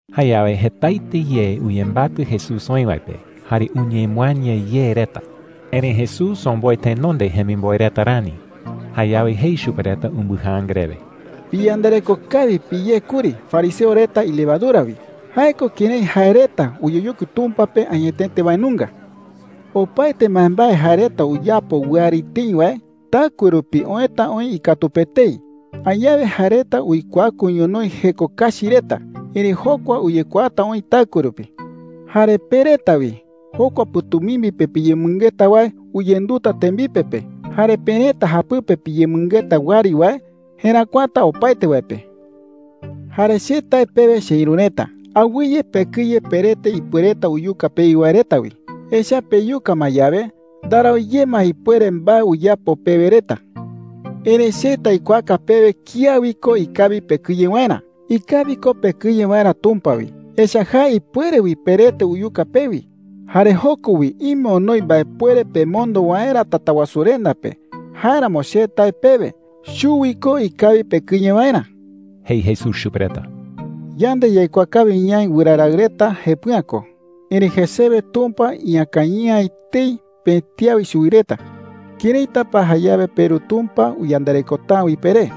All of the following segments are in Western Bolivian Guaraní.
Jayawe jetaete ye uyembatɨ Jesús oï wae pe, jare uñemɨaña ye reta. Erëi Jesús omboe tenonde jemimboe reta rani. Jayawe jei chupe reta umbɨjaanga rewe: “Piyandareko kawi piyé kuri fariseo reta ilevadura wi – jae ko kërái jae reta uyeyokui Tumpa pe añetete wae nunga,” jei chupe reta. “Opaete mbaembae jae reta uyapo wɨari tëi wae, taɨkue rupi oëta oï ikatu pe etei. Añawe jae reta uikuaku ñonoï jeko kachi reta, erëi jokua uyekuaata oï taɨkue rupi,” jei. “Jare pe reta wi, jokua pɨ̈tumimbi pe piyemɨngeta wae uyenduta tembipe pe. Jare perëta japɨpe piyemɨngeta wɨari wae jeräkuata opaete wae pe,” jei chupe reta. “Jare che tae pewe cheïru reta, awɨye pekɨye perete ipuereta uyuka pewi wae reta wi. Echa’ä peyuka ma yawe, ndarau ye ma ipuere mbae uyapo pewe reta,” jei. “Erëi che taikuaaka pewe kía wi ko ikawi pekɨye waerä. Ikawi ko pekɨye waerä Tumpa wi. Echa’ä jae ipuere wi perete uyuka pewi. Jare joko wi ime onoi mbaepuere pemondo waerä Tatawasurenda pe. Jáeramo che tae pewe, chuwi ko ikawi pekɨye waerä,” jei Jesús chupe reta. “Yande yaikuaa kawi ñaï wɨra raɨ reta jepɨ'ä ko. Erëitu jesewe Tumpa iñakañɨ'ä etei pëti awe chuwi reta. ¿Këraita pa jayawe peRu Tumpa uyandarekota’ä wi peré?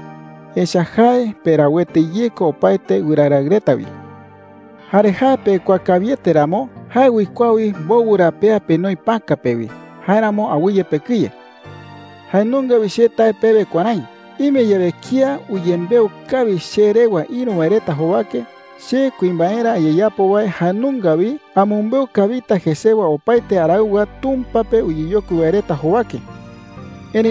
Echa’ä jae perauete ye ko opaete wɨra raɨ reta wi,” jei chupe reta. “Jare jae pekuaa kawiete ramo, jae uikuaa wi mbowɨ ra pea penoi päka pe wi. Jáeramo awɨye pekɨye,” jei chupe reta. “Jae nunga wi che tae pewe kuärái: Ime yawe kía uyembeu kawi che rewa ïru wae reta jowake, che kuimbaerä ayeyapo wae jae nunga wi amɨmbeu kawita jesewa opaete araɨwa Tumpa pe uyeyokui wae reta jowake,” jei.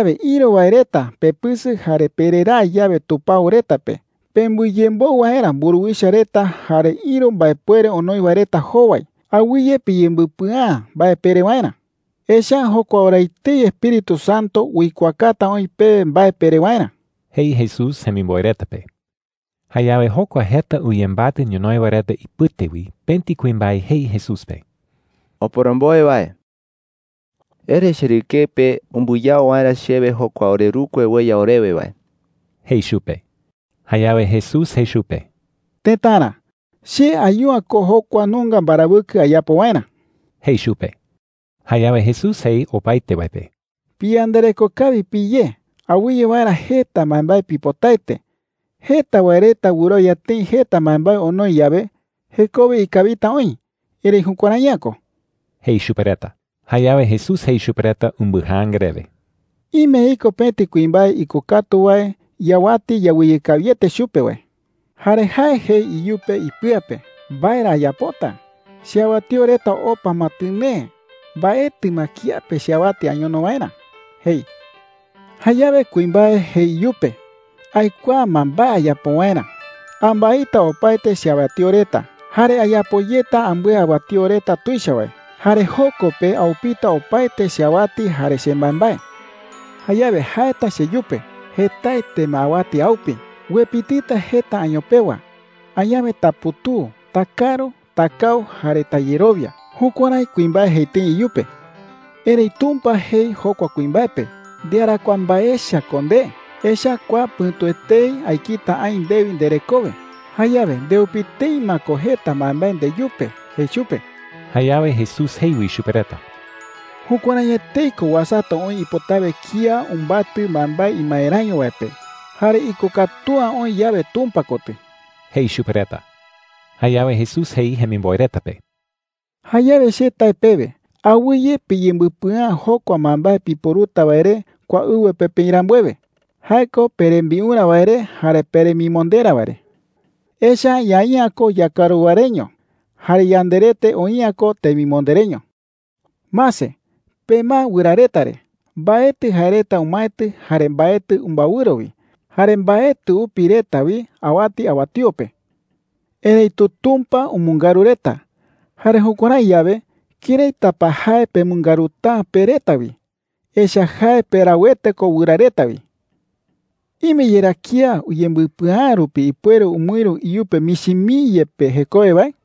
“Jayawe ïru wae reta pepɨsɨ jare pereraa yawe tupao reta pe pembɨyemboɨ waerä mburuwicha reta jare ïru mbaepuere onoi wae reta jowai, awɨye piyembɨpɨa’ä mbae pere waerä. Echa’ä jokua ora etei Espíritu Santo uikuaakata oï pewe mbae pere waerä,” jei Jesús jemimboe reta pe. Jayawe jokua jeta uyembatɨ ñonoï wae reta ipɨte wi pëti kuimbae jei Jesús pe: “Oporomboe wae,” jei. “Ere cherɨkeɨ pe umbɨyao waerä chewe jokua orerukue ueya orewe wae,” jei chupe. Jayawe Jesús jei chupe: “Tëtara, che ayu’ä ko jokua nunga mbarawɨkɨ ayapo waerä,” jei chupe. Jayawe Jesús jei opaete wae pe: “Piyandareko kawi piyé awɨye waerä jeta mbaembae pipotaete. Jeta wae reta wɨrowia tëi jeta mbaembae onoi yawe, jekowe ikawita oï. Erëi jukuärai’ä ko,” jei chupe reta. Jayawe Jesús jei chupe reta umbɨjaanga rewe: “Ime iko pëti kuimbae ikokatu wae iawati yawɨye kawiete chupe wae. Jare jae jei iyupe ipɨa pe: “¿Mbae ra ayapota? Cheawatío reta opa ma tɨnee. Mbaetɨ ma kiape cheawati añono waerä,’ jei. Jayawe kuimbae jei iyupe: ‘¡Aikuaa ma mbae ayapo waerä! Ambaita opaete cheawatío reta jare ayapo yeta ambɨe awatío reta tuicha wae. Jare joko pe aupita opaete cheawati jare chembaembae. Jayawe jaeta cheyupe: ‘Jetaete ma awati aupi. Uepitɨta jeta año pewa. Añawe taputuu, takaru, takau, jare tayerowia.’ Jukuärái kuimbae jei tëi iyupe. “Erëi Tumpa jei jokua kuimbae pe: ‘¡Ndearakuaa mbae echa ko nde! Echa’ä kua pɨ̈tu etei aekita aï ndewi nderekowe. Jayawe ndeupi tëi ma ko jeta mbaembae ndeyupe,’ jei chupe.” Jayawe Jesús jei wi chupe reta: “Jukuärái etei ko uasata oï ipotawe kía umbatɨ mbaembae imaeräño wae pe, jare ikokatu’ä oï yawe Tumpa kotɨ,” jei chupe reta. Jayawe Jesús jei jemimboe reta pe: “Jayawe che tae pewe, awɨye piyembɨpɨa’ä jokua mbaembae piporuta wae re kua ɨwɨ pe peï rambuewe – jae ko perembiurä wae re jare peremimonderä wae re,” jei. “Echa’ä ñaï'ä ko yakaru wae reño. Jare yanderete oï'ä ko temimonde reño,” jei chupe reta. “Mase. Pemae wɨra reta re. Mbaetɨ jae reta umaetɨ jare mbaetɨ umbaewɨro wi. Jare mbaetɨ upi reta wi awati awatío pe,” jei. “Erëitu Tumpa umɨngaru reta. Jare jukuärái yawe, ¿këraita pa jae pemɨngaruta’ä pe reta wi? Echa’ä jae perauete ko wɨra reta wi,” jei chupe reta. “¿Ime yerá kía uyembɨpɨa’ä rupi ipuere umɨïru iyupe michi mii yepe jekowe wae?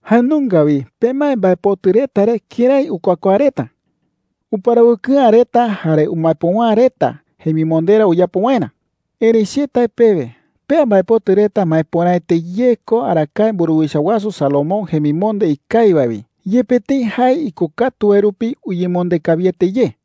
“Jae nunga wi pemae mbaepotɨ reta re kërái ukuakuaa reta,” jei. “Uparawɨkɨ'ä reta jare umaepöwa’ä reta jemimonderä uyapo waerä. Erëi che tae pewe, pea mbaepotɨ reta maepöraete ye ko arakae mburuwicha wasu Salomón jemimonde ikawi wae wi, yepe tëi jae ikokatu wae rupi uyemonde kawiete ye,” jei.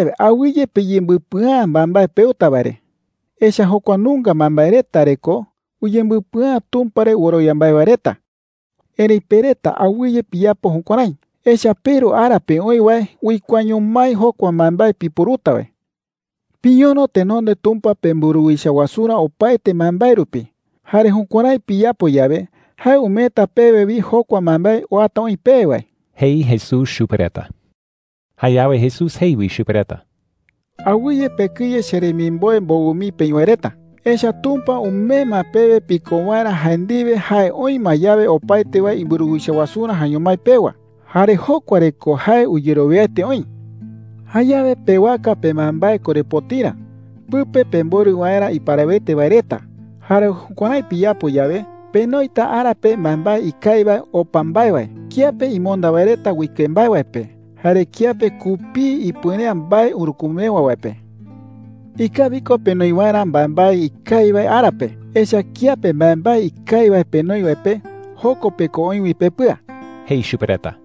“Jayawe awɨye piyembɨpɨa’ä mbaembae peuta wae re,” jei. “Echa’ä jokua nunga mbaembae reta re ko uyembɨpɨa’ä Tumpa re wɨrowia mbae wae reta. Erëi pe reta, awɨye piyapo jukuärái, echa’ä peRu ara pe oï wae uikuaaño mái jokua mbaembae piporuta wae,” jei. “Piñono tenonde Tumpa pemburuwicha wasurä opaete mbaembae rupi. Jare jukuärái piyapo yawe, jae umeeta pewe wi jokua mbaembae uata oï pewe wae,” jei Jesús chupe reta. Jayawe Jesús jei wi chupe reta: “Awɨye pekɨye, cheremimboe mbowɨ mii peï wae reta. Echa’ä Tumpa umee ma pewe piko waerä jae ndiwe jae oï ma yawe opaete wae imburuwicha wasurä jaeño mái pewa. Jare jokua re ko jae uyerowiaete oï,” jei chupe reta. “Jayawe pewaka pembaembae korepotirä, pɨpe pemborɨ waerä iparawete wae reta. Jare jukuärái piyapo yawe, penoita ara pe mbaembae ikawi wae opa mbae wae, kiape imonda wae reta uike mbae wae pe jare kiape kupii ipuere’ä mbae urükumewa wae pe,” jei. “Ikawi ko penoi waerä mbaembae ikawi wae ara pe, echa’ä kiape mbaembae ikawi wae penoi wae pe, joko pe ko oï wi pepɨa,” jei chupe reta.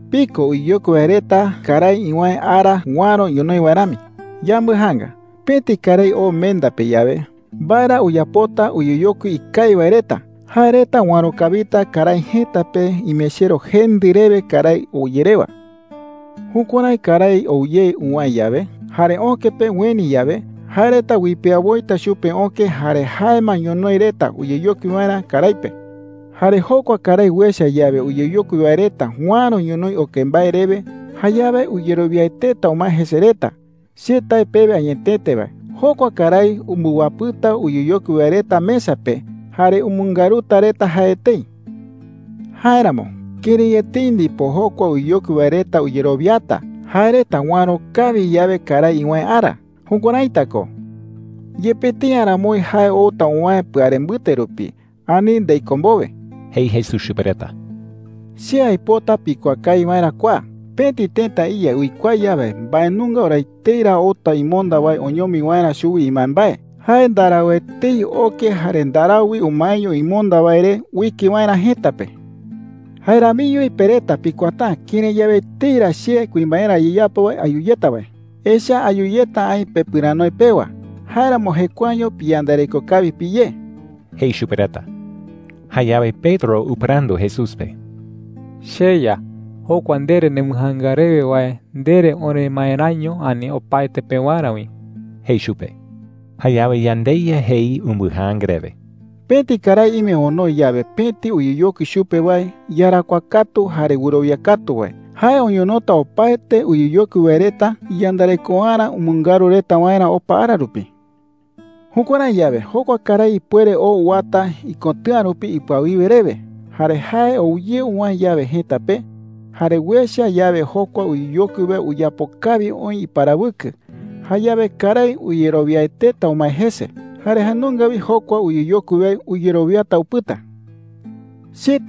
“Piko uyeyokui wae reta karái iwäe ara uäro ñonoï wae rami. Yambɨjaanga. Pëti karái oo menda pe yawe, ¿mbae ra uyapota uyeyokui ikawi wae reta? Jae reta uäro kawita karái jëta pe imechero jendɨ rewe karái ou ye rewa,” jei. “Jukuärái karái ou ye uwäe yawe jare öke pe ueni yawe, jae reta uipea woita chupe öke jare jae ma ñonoï reta uyeyokui waerä karái pe,” jei. “Jare jokua karái uecha yawe uyeyokui wae reta uäro ñonoï oke mbae rewe, jayawe uyerowiaeteta umae jese reta. Che tae pewe añetete wae, jokua karái umbɨwapɨta uyeyokui wae reta mesa pe jare umɨngaruta reta jae etei,” jei. “Jáeramo, ¡kërái etei ndipo jokua uyeyokui wae reta uyerowiata jae reta uäro kawi yawe karái iwäe ara! Jukuäraita ko, yepe tëi aramoi jae outa uwäe pɨare mbɨte rupi ani ndei köe mbowe,” jei Jesús chupe reta. “Che aipota pikuaa kawi waerä kua: Pëti tëta iya uikuaa yawe mbae nunga ora etei ra outa imonda wae oñomi waerä chuwi imbaembae, jae ndarau etei oke jare ndarau wi umaeño imonda wae re uike waerä jëta pe,” jei. “Jae ramiño wi pe reta pikuaata’ä kërái yawe etei ra che kuimbaerä ayeyapo wae ayu yeta wae. Echa’ä ayu yeta aï pepɨranoe pewa. Jáeramo jekuaeño piyandareko kawi piyé,” jei chupe reta. Jayawe Pedro upɨrandu Jesús pe: “CheYa, jokua ndere nembɨjaanga rewe wae, ¿ndere oremaeräño, ani opaete pewarä wi?” jei chupe. Jayawe yandeYa jei umbɨjaanga rewe: “Pëti karái ime onoi yawe pëti uyeyokui chupe wae iyarakuaa katu jare wɨrowia katu wae, jae oñonota opaete uyeyokui wae reta iyandarekoarä umɨngaru reta waerä opa ara rupi,” jei. “Jukuärái yawe, jokua karái ipuere oo uwata ikotɨ̈a rupi ipɨawiwe rewe. Jare jae ou ye uwäe yawe jëta pe, jare uecha yawe jokua uyeyokui wae uyapo kawi oï iparawɨkɨ, jayawe karái uyerowiaeteta umae jese. Jare jae nunga wi jokua uyeyokui wae uyerowiata upɨta,” jei.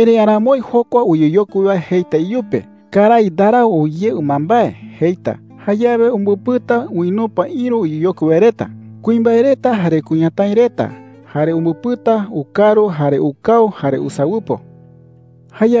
“Erëi aramoi jokua uyeyokui wae jeita iyupe: ‘Karái ndarau ou ye ɨmambae,’ jeita. Jayawe umbɨpɨta uinupa ïru uyeyokui wae reta – kuimbae reta jare kuñatái reta – jare umbɨpɨta ukaru, jare ukau, jare usawɨpo,” jei.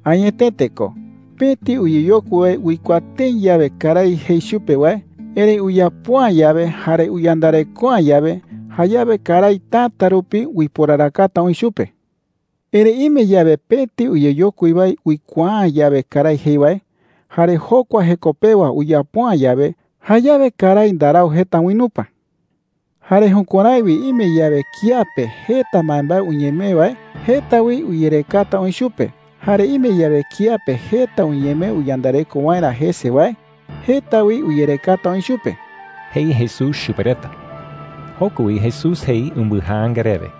“Añetete ko, pëti uyeyokui wae uikuaa tëi yawe karái jei chupe wae, erëi uyapo’ä yawe jare uyandareko’ä yawe, jayawe karái täta rupi uiporarakata oï chupe,” jei. “Erëi ime yawe pëti uyeyokui wae uikuaa’ä yawe karái jei wae, jare jokua jeko pewa uyapo’ä yawe, jayawe karái ndarau jeta uinupa,” jei. “Jare jukuärái wi ime yawe kía pe jeta mbaembae uñemee wae, jeta wi uyerekata oï chupe. Jare ime yawe kía pe jeta uñemee uyandareko waerä jese wae, jeta wi uyerekata oï chupe,” jei Jesús chupe reta. Joko wi Jesús jei umbɨjaanga rewe: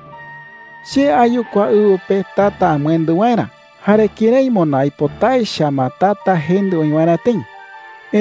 “Che ayu kua ɨwɨ pe tata amɨendɨ waerä, jare ¡kërái moná aipota echa ma tata jendɨ oï waerä tëi!” jei.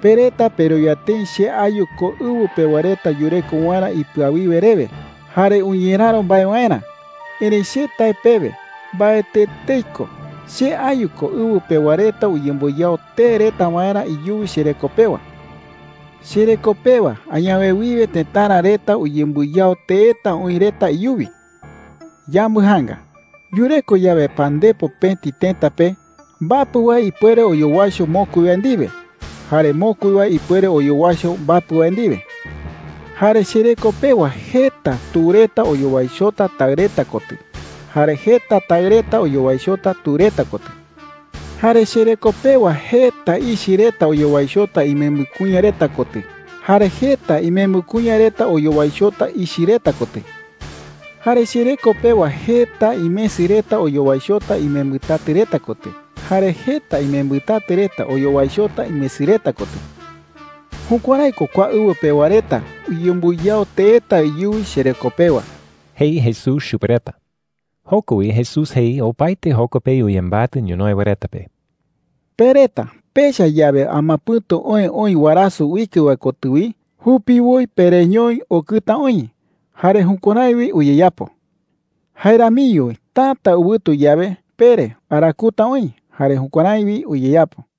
“Pe reta perowia tëi che ayu ko ɨwɨ pewa reta yureko waerä ipɨawiwe rewe jare uñeräro mbae waerä. Erëi che tae pewe, mbaetɨ etei ko. Che ayu ko ɨwɨ pewa reta uyembɨyao tee reta waerä iyuwi chereko pewa,” jei. “Chereko pewa añawe wiwe tëtara reta uyembɨyao teeta oï reta iyuwi,” jei. “Yambɨjaanga. Yureko yawe pandepo pëti tëta pe, mbapɨ wae ipuere oyowaicho mokui wae ndiwe, jare mokui wae ipuere oyowaicho mbapɨ wae ndiwe,” jei. “Jare chereko pewa jeta tu reta oyowaichota taɨ reta kotɨ, jare jeta taɨ reta oyowaichota tu reta kotɨ,” jei. “Jare chereko pewa jeta ichɨ reta oyowaichota imembɨ kuña reta kotɨ, jare jeta imembɨ kuña reta oyowaichota ichɨ reta kotɨ,” jei. “Jare chereko pewa jeta imesɨ reta oyowaichota imembɨtatɨ reta kotɨ, jare jeta imembɨtatɨ reta oyowaichota imesɨ reta kotɨ,” jei. “Jukuärái ko kua ɨwɨ pewa reta uyembɨyao teeta iyuwi chereko pewa,” jei Jesús chupe reta. Joko wi Jesús jei opaete joko pe uyembatɨ ñonoï wae reta pe: “Pe reta pecha yawe amapɨ̈tu oë oï warasɨ uike wae kotɨ wi, jupiwoi pereñoi, ‘Okɨta oï.’ Jare jukuärái wi uyeyapo,” jei. “Jae ramiño wi täta ɨwɨtu yawe, pere, ‘Arakuta oï.’ Jare jukuärái wi uyeyapo,” jei.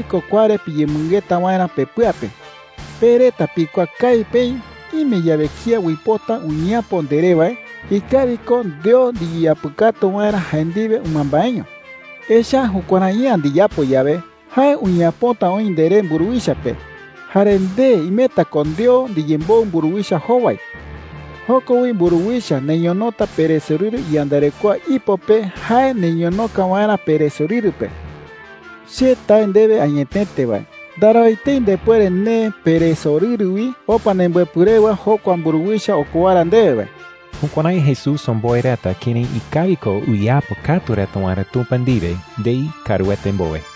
“Ikawi ko kua re piyemɨngeta waerä pepɨa pe. Pe reta pikuaa kawi peï, ime yawe kía uipota uñeapo nderé wae, ikawi ko ndeo ndiyeapɨkatu waerä jae ndiwe ɨmambaeño. Echa’ä jukuärai’ä ndiyapo yawe, jae uñeapota oï nderé mburuwicha pe, jare nde imeta ko ndeo ndiyemboɨ mburuwicha jowai. Joko wi mburuwicha neñonota peresorɨru iyandarekoa ipo pe jae neñonoka waerä peresorɨru pe,” jei. “Che tae ndewe añetete wae, ndarau etei ndepuere neë peresorɨru wi opa nembɨepɨ rewa jokua mburuwicha okowara ndewe wae.” Jukuärái Jesús omboe reta kërái ikawi ko uyeapɨkatu reta waerä Tumpa ndiwe ndei kaaruete mbowe.